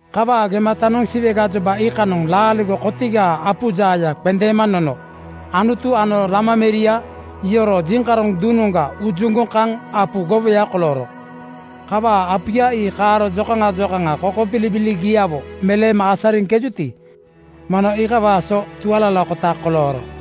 Kawaa gematanoŋ Siwe gajoba iikanoŋ laaligo kotigaa apu jaaya qendeema nono Anutu ano Lama meria yoroo jiŋkaroŋ duŋnoŋga ujuŋgoŋ kaŋ apu gowoya kolooro. Kawaa apuya ii kaaro jokaŋa jokaŋa kokobilibiligiawo meleema asariŋkejuti, mono iikawaa so tualalakota kolooro.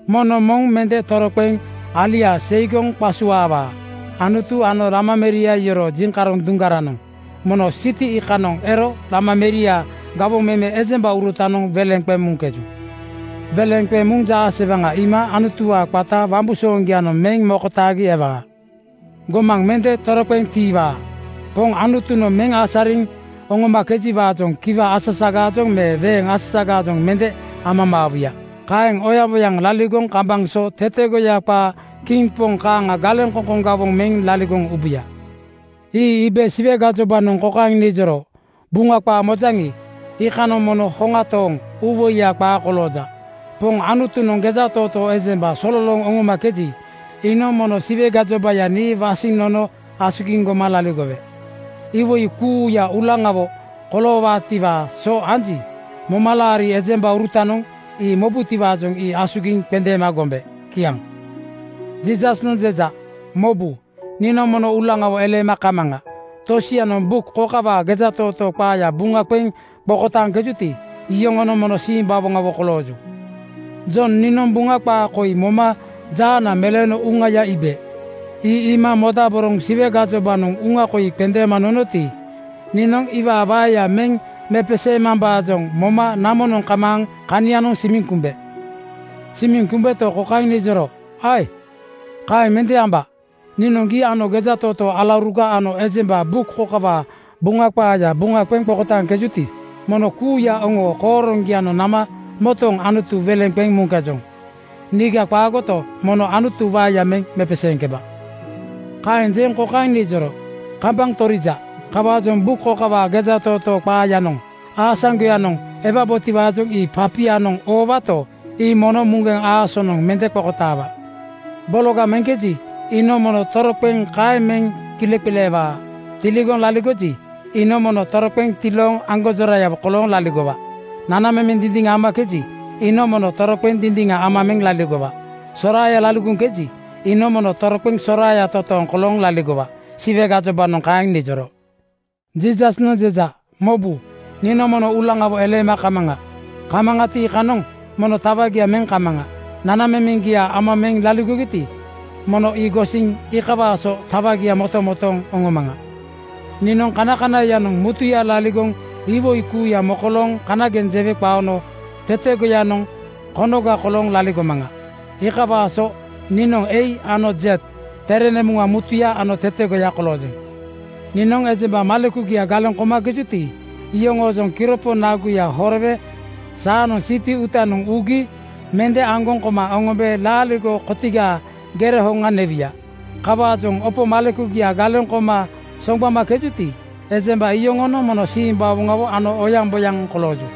Moŋnoŋ moŋ mende toroqeŋ alia seigoŋ qasuaawaa. Anutu ano Lama meria yoroo jiŋkaroŋ duŋgaranoŋ mono siti iikanoŋ ero Lama meriaa gawoŋ meme ejembaurutanoŋ weleŋ qeŋ muŋkeju. Weleŋ qeŋ muŋ jaasewaŋa iima Anutuwaa qata wambusooŋgianoŋ meŋ mokotaagi ewaa. Gomaŋ mende toroqeŋ tiiwaa. Poŋ Anutunoŋ meŋ asariŋ oŋomakejiwaajoŋ kiwa asasagaajoŋ me weeŋ asasagaajoŋ mende amamaawuya. Kaeŋ oyaŋboyaŋ laligoŋ kambaŋ so tetegoya qaa kiŋ poŋ kaaŋa galeŋkoŋkoŋ gawoŋ meŋ laligoŋ ubuya. Ii iibe Siwe gajobanoŋ kokaeŋ nijoro, “Buŋa qaa mojaŋi, iikanoŋ mono hoŋa tooŋ uuwoiya qaa kolooja. Poŋ Anutunoŋ gejatootoo ejemba sololooŋ oŋomakeji, iinoŋ mono Siwe gajobaya nii wasiŋ nono asugiŋ goma laligowe. Iwoi kuuya uulaŋawo koloowutiwaa so anji, momalaari ejembaurutanoŋ ii mobutiwaajoŋ ii asugiŋ qendeema gombe.” Kiaŋ. Jiisasnoŋ jeja, “Mobu, niinoŋ mono uulaŋawo eleema kamaŋa. Tosianoŋ buk kokawaa gejatootoo qaaya buŋa qeŋ qokotaaŋkejuti, iyoŋonoŋ mono simbawoŋawo kolooju.” Jon niinoŋ Buŋa qaa koi moma jaana meleeno uŋaya iibe. Ii iima modaboroŋ Siwe gajobanoŋ uŋa koi qendeema nonoti, niinoŋ iwaa waeya meŋ mepeseemambaajoŋ moma namonoŋ kamaaŋ kanianoŋ simiŋ kumbe. Simiŋ kumbeto, kokaeŋ nijoro, “Ae! Kaeŋ mende amba. Niinoŋ gii ano gejatootoo alauruga ano ejemba buk kokawaa Buŋa qaaya buŋa qeŋ qokotaaŋkejuti, mono kuuya oŋoo kooroŋgianoŋ nama motooŋ Anutu weleŋ qeŋ muŋkejoŋ. Niiga qaagoto, mono Anutu waeya meŋ mepeseeŋkeba.” Kaeŋ jeŋ kokaeŋ nijoro, “Kambaŋ torija. Kawaajoŋ buk kokawaa gejatootoo qaayanoŋ aasaŋgoyanoŋ ewabotiwaajoŋ ii papia-noŋ oowato, ii mono muŋgeŋ aasonoŋ (siil) mende qokotaawa. Bologa meŋkeji, iinoŋ mono toroqeŋ kaeŋ meŋ kileqileewa. Tilooŋ laligoji, iinoŋ mono toroqeŋ tilooŋ aŋgonjorayawo kolooŋ laligowa. Nanamemeŋ dindiŋa amakeji, iinoŋ mono toroqeŋ dindiŋagadeeŋ ama meŋ laligowa. Soraaya kolooŋkeji, iinoŋ mono toroqeŋ soraaya totooŋ kolooŋ laligowa.” Siwe gajobanoŋ kaeŋ nijoro. Jiisasnoŋ jeja, “Mobu, niinoŋ mono uulaŋawo eleema kamaŋa. Kamaŋati, iikanoŋ mono tawagia meŋ kamaŋa. Nanamemeŋgia ama meŋ laligogiti, mono ii gosiŋ iikawaa so tawagia motomotooŋ oŋomaŋa. “Niinoŋ kanakanaiyanoŋ mutuya laligoŋ (iwoi kuuya mokolooŋ kanageŋ jewe qaono) tetegoyanoŋ konoga kolooŋ laligomaŋa. Iikawaa so niinoŋ A ano Z, tere nemuŋa mutuya ano tetegoya koloojeŋ. “Niinoŋ ejemba malekugia galeŋ komakejuti, iyoŋoojoŋ kiropo naguya horowe saanoŋ siti uutanoŋ ugi mende aŋgoŋ koma oŋombe laaligo kotigaa gere hoŋa newuya. Kawaajoŋ opo malekugia galeŋ koma soŋgbamakejuti, ejemba iyoŋonoŋ mono simbawoŋawo ano oyaŋboyaŋ kolooju.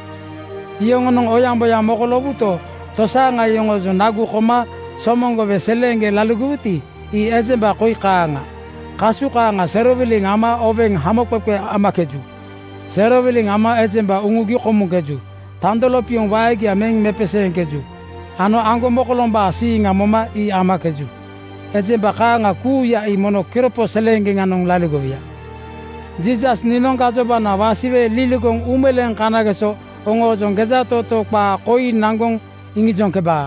“Yoŋonoŋ oyaŋboyaŋ mokoloowuto, tosaaŋa yoŋoojoŋ nagu koma somoŋgowe seleeŋgeŋ laligowuti, ii ejemba koi kaaŋa: Kasu kaaŋa serowiliŋ ama oweŋ hamoqeqe amakeju. Serowiliŋ ama ejemba uŋugi komuŋkeju. Tando lopioŋ waegia meŋ mepeseeŋkeju ano aŋgomokolombaa siiŋa moma ii amakeju. Ejemba kaaŋa kuuya ii mono kiropo seleeŋgeŋanoŋ laligowuya. “Jiisas niinoŋ gajobana wasiwe liligoŋ uumeleeŋ kanageso oŋoojoŋ gejatootoo qaa koi naŋgoŋ iŋijoŋkebaa.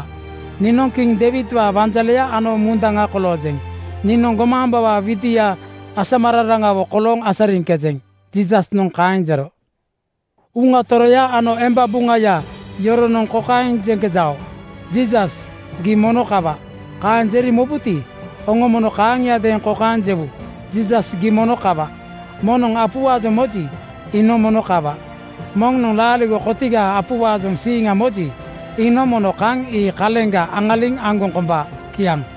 Niinoŋ kiŋ Deiwidwaa wanjaleya ano mundaŋa koloojeŋ. Niinoŋ gomaambawaa widia asamararanawo kolooŋ asariŋkejeŋ.” Jiisasnoŋ kaeŋ jero. Uŋa Toroya ano emba buŋaya yoronoŋ kokaeŋ jeŋkejao, “Jiisas, gii mono kawa.” Kaeŋ jeri mobuti, oŋo mono kaaŋiadeeŋ kokaeŋ jewu, “Jiisas, gii mono kawa.” Moŋnoŋ apuwaajoŋ moji, iinoŋ mono kawa. Moŋnoŋ laaligo kotigaa apuwaajoŋ siiŋa moji, iinoŋ mono kaŋ ii kaleŋga aŋaliŋ aŋgoŋ komba. Kiaŋ.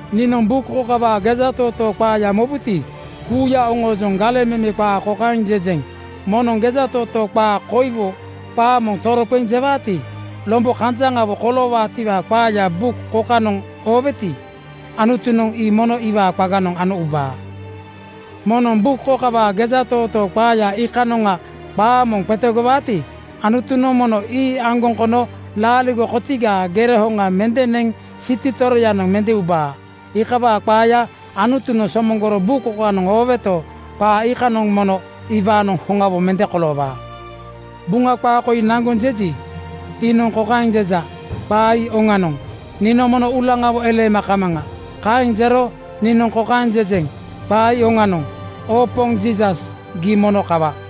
Niinoŋ buk kokawaa gejatootoo qaaya mobuti, kuuya oŋoojoŋ galeŋ meme qaa kokaeŋ jejeŋ: Moŋnoŋ gejatootoo qaa koiwo qaa moŋ toroqeŋ jewaati, lombo kanjaŋawo koloowaatiwaa qaaya buk kokanoŋ ooweti, Anutunoŋ ii mono iwaa qaganoŋ ano ubaa. Moŋnoŋ buk kokawaa gejatootoo qaaya iikanoŋga qaa moŋ qetegowaati, Anutunoŋ mono ii aŋgoŋ kono laaligo kotigaa gere hoŋa mende neŋ siti toroyanoŋ mende ubaa. Iikawaa qaaya Anutunoŋ somoŋgoro buk kokanoŋ ooweto, qaa iikanoŋ mono iwaanoŋ hoŋawo mende koloowaa. Buŋa qaa koi naŋgoŋ jeji, iinoŋ kokaeŋ jeja, “Qaa ii oŋanoŋ. Niinoŋ mono uulaŋawo eleema kamaŋa.” Kaeŋ jero niinoŋ kokaeŋ jejeŋ, “Qaa ii oŋanoŋ. Oo Poŋ Jiisas, gii mono kawa.”